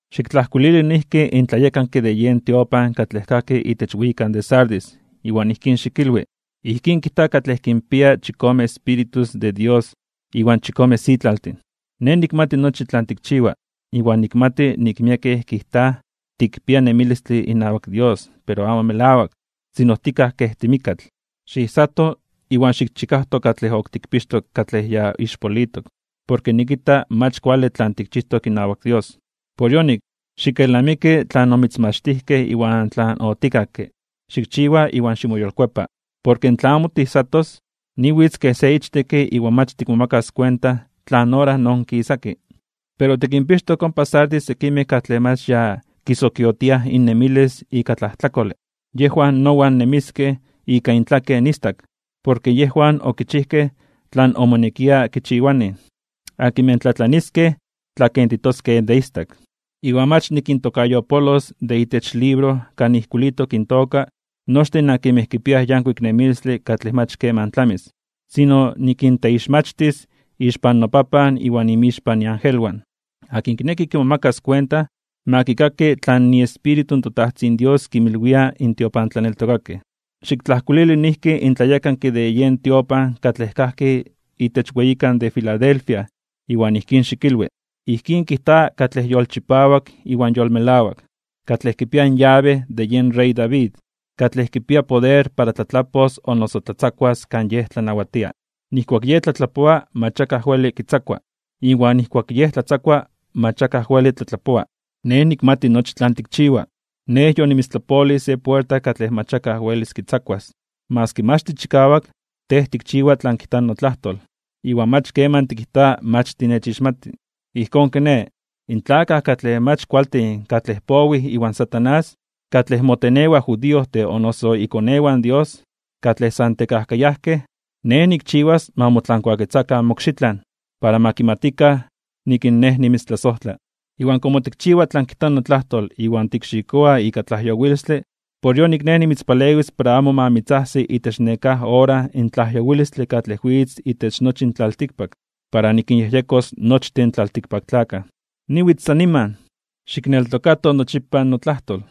’Xiktlajkuilili noijki in tlayekanke de yen tiopan katlej kajki itech weyikan de Sardis iwan ijkín xikilwi: “Ijkín kijta katlej kinpia chikome Espíritus de Dios iwan chikome sitlaltin: Nej nikmati nochi tlan tikchiwa, iwan nikmati nik miekej kijtaj tikpia nemilistle inawak Dios pero amo melawak, sino tikaj kej timikkatl. Xiijsato, iwan xikchikajto katlej ok tikpixtok katlej ya ixpolitok. Porke nikita mach kuale tlan tikchijtok inawak Dios. Por yonik, xikelnamiki tlan omitzmachtijkej iwan tlan otikakke. Xikchiwa iwan ximoyolkuepa. Porke tla amo tiijsatos, niwitz kej se ichtekke iwan mach tikmomakas kuenta tlan ora noonkisaki. Pero tikinpixtok ompa Sardis sekimej katlej mach ya kisokiotia innemilis ika tlajtlakole. Yejwan nowan nemiskej ika intlaken istak, porke yejwan okichijkej tlan omonekia kichiwanij. Akinmej tlatlaniskej, tlakentitoskej de istak, iwan mach nikintokayopolos de itech libro kan ijkuilitok intoka nochtin akinmej kipiaj yankuik nemilistle katlej mach keman tlamis, sino nikinteixmachtis (nikinteititis) ixpan noPapan iwan inmixpan iangelwan. Akin kineki kimomakas kuenta, ma kikaki tlan iEspíritu in toTajtzin Dios kinmilwia in tiopantlaneltokakej.” ’Xiktlajkuilili noijki in tlayekanke de yen tiopan katlej kajki itech weyikan de Filadelfia iwan ijkín xikilwi: “Ijkín kijta katlej yolchipawak iwan yolmelawak, katlej kipia in yabe de yen rey David, katlej kipia poder para tlatlapos o noso tlatzakuas kan Yej tlanawatia. Nijkuak Yej tlatlapoa mach akaj weli kitzakua. Iwan nijkuak Yej tlatzakua mach akaj weli tlatlapoa: Nej nikmati nochi tlan tikchiwa. Nej yonimitztlapolij se puerta katlej mach akaj welis kitzakuas. Maski mach tichikawak, tej tikchiwa tlan kijta notlajtol, iwan mach keman tikijta mach tinechixmati. Ijkón kiné, in tlakaj katlej mach kualtin katlej powij iwan Satanás, katlej motenewaj judiojtin o noso ikonewan in Dios, katlej san tekajkayajkej, Nej nikchiwas ma motlankuaketzakan mokxitlan, para ma kimatikan nik Nej nimitztlasojtla. Iwan komo tikchiwa tlan kijta notlajtol iwan tikxikoa ika tlajyowilistle, por yonik Nej nimitzpalewis para amo ma mitzajsi itech nekáj ora in tlajyowilistle katlej witz itech nochi in tlaltikpak, para nikinyejyekos nochtin in tlaltikpaktlakaj. Niwitz san niman. Xikneltokato nochipa notlajtol,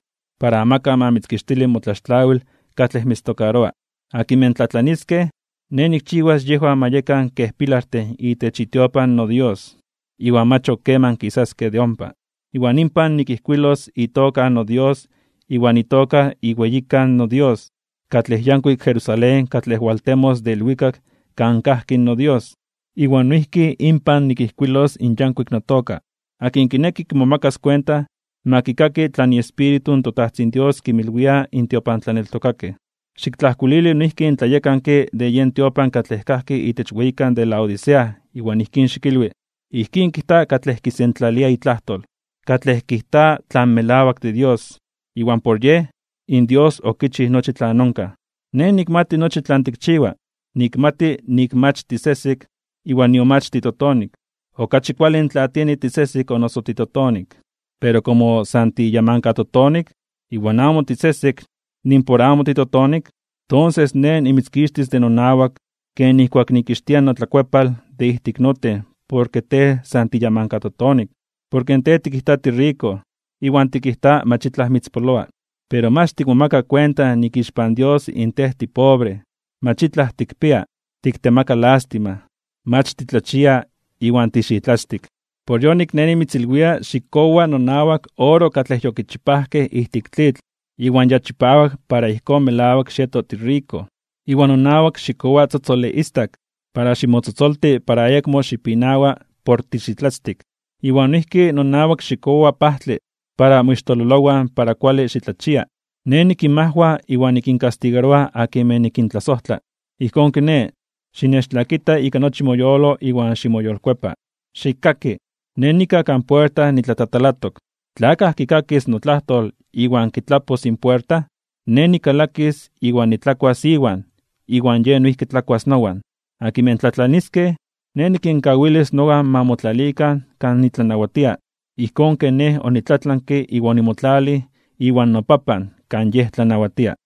para amakaj ma mitzkixtili motlaxtlawil katlej mitztokaroa. Akinmej tlatlaniskej, Nej nikchiwas yejwan ma yekan kej pilartin itech itiopan noDios, iwan mach ok keman kisaskej de ompa. Iwan inpan nikijkuilos itoka in noDios iwan itoka iweyikan noDios, katlej yankuik Jerusalén katlej waltemos de ilwikak kan kajki noDios. Iwan noijki inpan nikijkuilos in yankuik notoka. Akin kineki kimomakas kuenta, ma kikaki tlan iEspíritu in toTajtzin Dios kinmilwia in tiopantlaneltokakej.” ’Xiktlajkuilili noijki in tlayekanke de yen tiopan katlej kajki itech weyikan de Laodicea iwan ijkín xikilwi: “Ijkín kijta katlej kisentlalia itlajtol, katlej kijta tlan melawak de Dios, iwan por Yej, in Dios okichij nochi tlan onkaj: Nej nikmati nochi tlan tikchiwa. Nikmati nik mach tisesek iwan nion mach titotonik. Okachi kuale tla tieni tisesek o noso titotonik. Pero komo san tiyamankatotonik, iwan amo tisesek nimpor amo titotonik, tonses Nej nimitzkixtis de nonawak ken nijkuak nikixtia notlakuepal de ijtik noten porke tej san tiyamankatotonik. Porke tej tikijta tiriko, iwan tikijta mach itlaj mitzpoloa. Pero mach tikmomaka kuenta nik ixpan Dios in tej tipobre, mach itlaj tikpia, tiktemaka lástima, mach titlachia iwan tixitlatztik. Por yonik, Nej nimitzilwia xikkowa nonawak oro katlej yokichipajkej ijtik tlitl iwan ya chipawak para ijkón melawak xieto tiriko. Iwan nonawak xikkowa tzotzole istak para ximotzotzolti para ayakmo xipinawa por tixitlatztik. Iwan noijki nonawak xikkowa pajtle para moixtololowan para kuale xitlachia. Nej nikinmajwa iwan nikinkastigaroa akinmej nikintlasojtla. Ijkón kiné, xinechtlakita ika nochi moyolo iwan ximoyolkuepa. Xikkaki. Nej nikaj kan puerta nitlatatalatok. Tla akaj kikakis notlajtol iwan kitlapos in puerta, Nej nikalakis iwan nitlakuas iwan, iwan yej noijki tlakuas nowan. Akinmej tlatlaniskej, Nej nikinkawilis nowan ma motlalikan kan nitlanawatia, ijkón ken Nej onitlatlanke iwan onimotlalij iwan noPapan kan Yej tlanawatia.